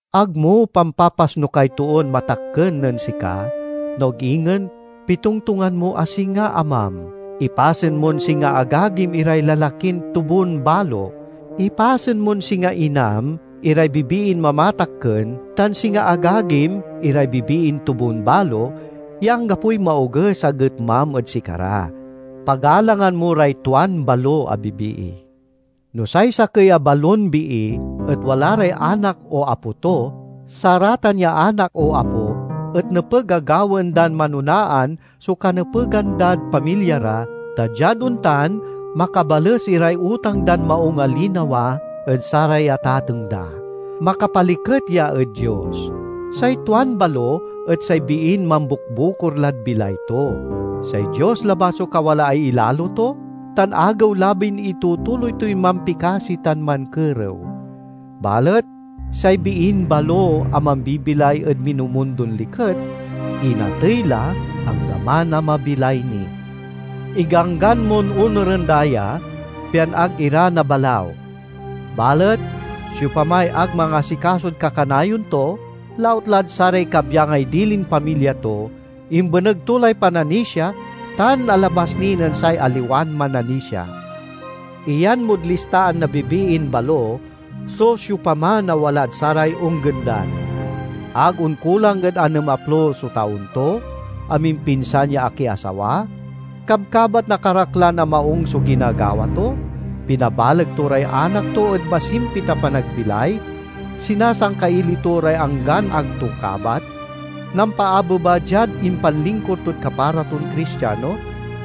Ag mo pampapasnukay toon matakken nen sika, no ag ingen pitongtongan mo a singa amam. Ipasen mon singa agagim iray lalakin tubon-balo. Ipasen mon singa inam iray bibiin mamatakken tan singa agagim iray bibiin tubon-balo, ya anggapoy maoges a getmam ed sikara. Pagalangan mo ray tuan balo a bibii. No say sakey a balon bii et wala ray anak o apo to, saratan ya anak o apo et nepeg a gawaen dan manonaan so kanepegan dad pamilya ra, ta diad ontan makabales iray utang dan maung a linawa ed saray atateng da. Makapaliket ya ed Dios. Say tuan balo et say biin mambukbukor lad bilay to. Say Dios labat so kawalaay ilalo to, tan agewlabin itutuloy toy mampikasi tan mankerew. Balet say biin balo a mambibilay ed minumundon liket, inatey la anggaman a mabilay ni. Iganggan mon onuren da ya, pian ag ira nabalaw. Balet siopamay ag mangasikasod kakanayon to, lautlad saray kabyangay dilin pamilya to, imbeneg to lay pananisia tan alabas ni nen say aliwan mananisia. Iyan mod listaan na bibiin balo so siopaman a walad saray onggendan: ag onkulang ed anemaplo so taon to, amimpinsan ya akiasawa, kabkabat na karaklan a maung so ginagawa to, pinabaleg to ray anak to ed masimpit a panagbilay, sinasangkaili to ray anggan ag to kabat, nampaabeba diad impanlingkur tod kapara ton Cristiano,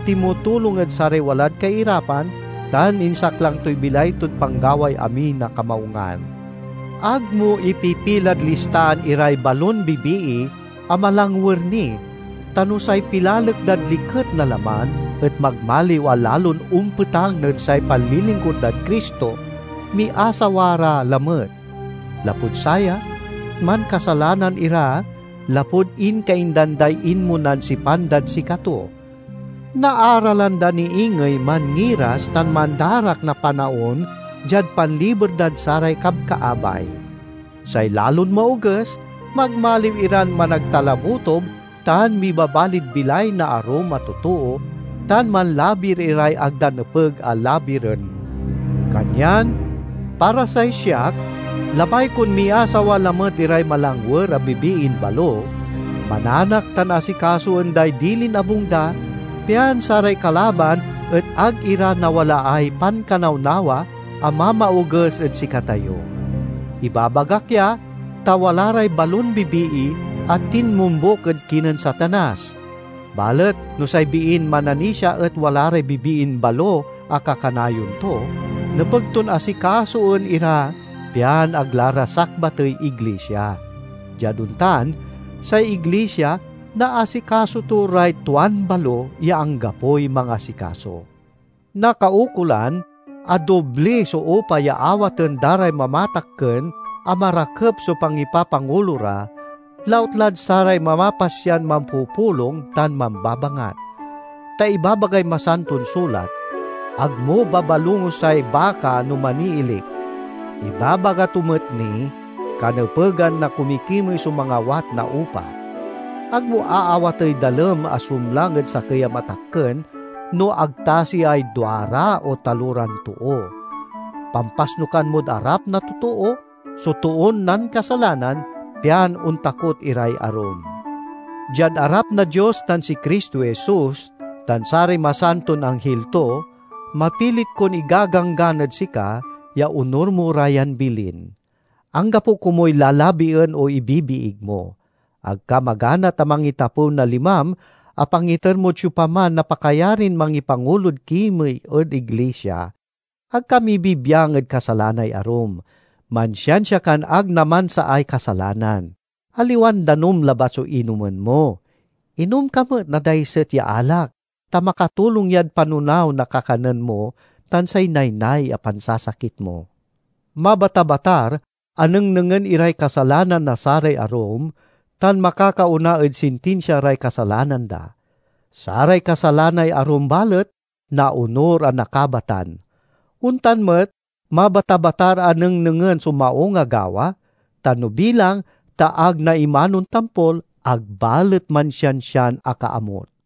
tinmutulong ed saray walad kairapan, tan insaklang toy bilay tod panggaway amin a kamaungan. Ag mo ipipilad listaan iray balon bibii a malangwer ni, ta no say pilalek dad liket na laman et magmaliw a lalon ompetang nen say panlilingkur dad Cristo, miasawa ra lamet. Lapud saya, mankasalanan ira lapud inkaindan day inmonan sipan dad sikato. Naaralan da ni ingey manngiras tan mandarak na panaon diad panliber dad saray kabkaabay. Say lalon maoges, magmaliw iran managtalabutob tan mibabalid bilay na arum a totoo, tan manlabir iray ag da nepeg a labiren. Kanyan para say siak, labay kon miasawa lamet iray malangwer a bibiin balo, mananak tan asikasoen day dilin abung da, pian saray kalaban et ag ira nawalaay pankanawnawa a mamaoges ed sikatayo. Ibabagak ya, ta wala ray balon bibii a tinmombuk ed kinen Satanas. Balet no say biin mananisia et wala ray bibiin balo a kakanayon to, nepeg ton asikasoen ira pian ag la ra sakbatey iglisia. Diad ontan, say iglisia naasikaso to ray tuan balo ya anggapoy mangasikaso. Nakaukolan a dobli so upa ya awaten da ray mamatakken a marakep so pangipapangulo ra, lautlad saray mamapasyan mampupulong tan mambabangat. Ta ibabagay Masanton Sulat, "Ag mo babalungosay baka no maniilik." Ibabaga to met ni, "Kanepegan na kumikimey so mangawat na upa." Ag mo aawatey dalem a sumlang ed sakey a matakken no ag tasiay duara o taloran too. Pampasnukan mod arap na totoo so toon nankasalanan, pian ontakot iray arum. Diad arap na Dios tan si Cristo Jesus tan saray masanton anghil to, mapilit kon igaganggan ed sika ya onur mo ra yan bilin. Anggapo komuy lalabien o ibibiig mo. Ag ka maganat a mangitapew na limam a pangiter mod siopaman na pakayarin mangipangulod kimey ed iglisia. Ag ka mibibiang ed kasalanay arum. Mansiansia kan ag namansaay kasalanan. Aliwan danum labat so inomen mo; inom ka met na daiset ya alak, ta makatulong yad panonaw na kakanen mo tan say naynay a pansasakit mo. Mabatabatar a nengnengen iray kasalanan na saray arum, tan makakaona ed sintinsia ray kasalanan da. Saray kasalanay arum balet, naonur a nakabatan. Ontan met mabatabatar a nengnengen so maung a gawa, tan no bilang ta ag naimanon tampol, ag balet mansiansian akaamut.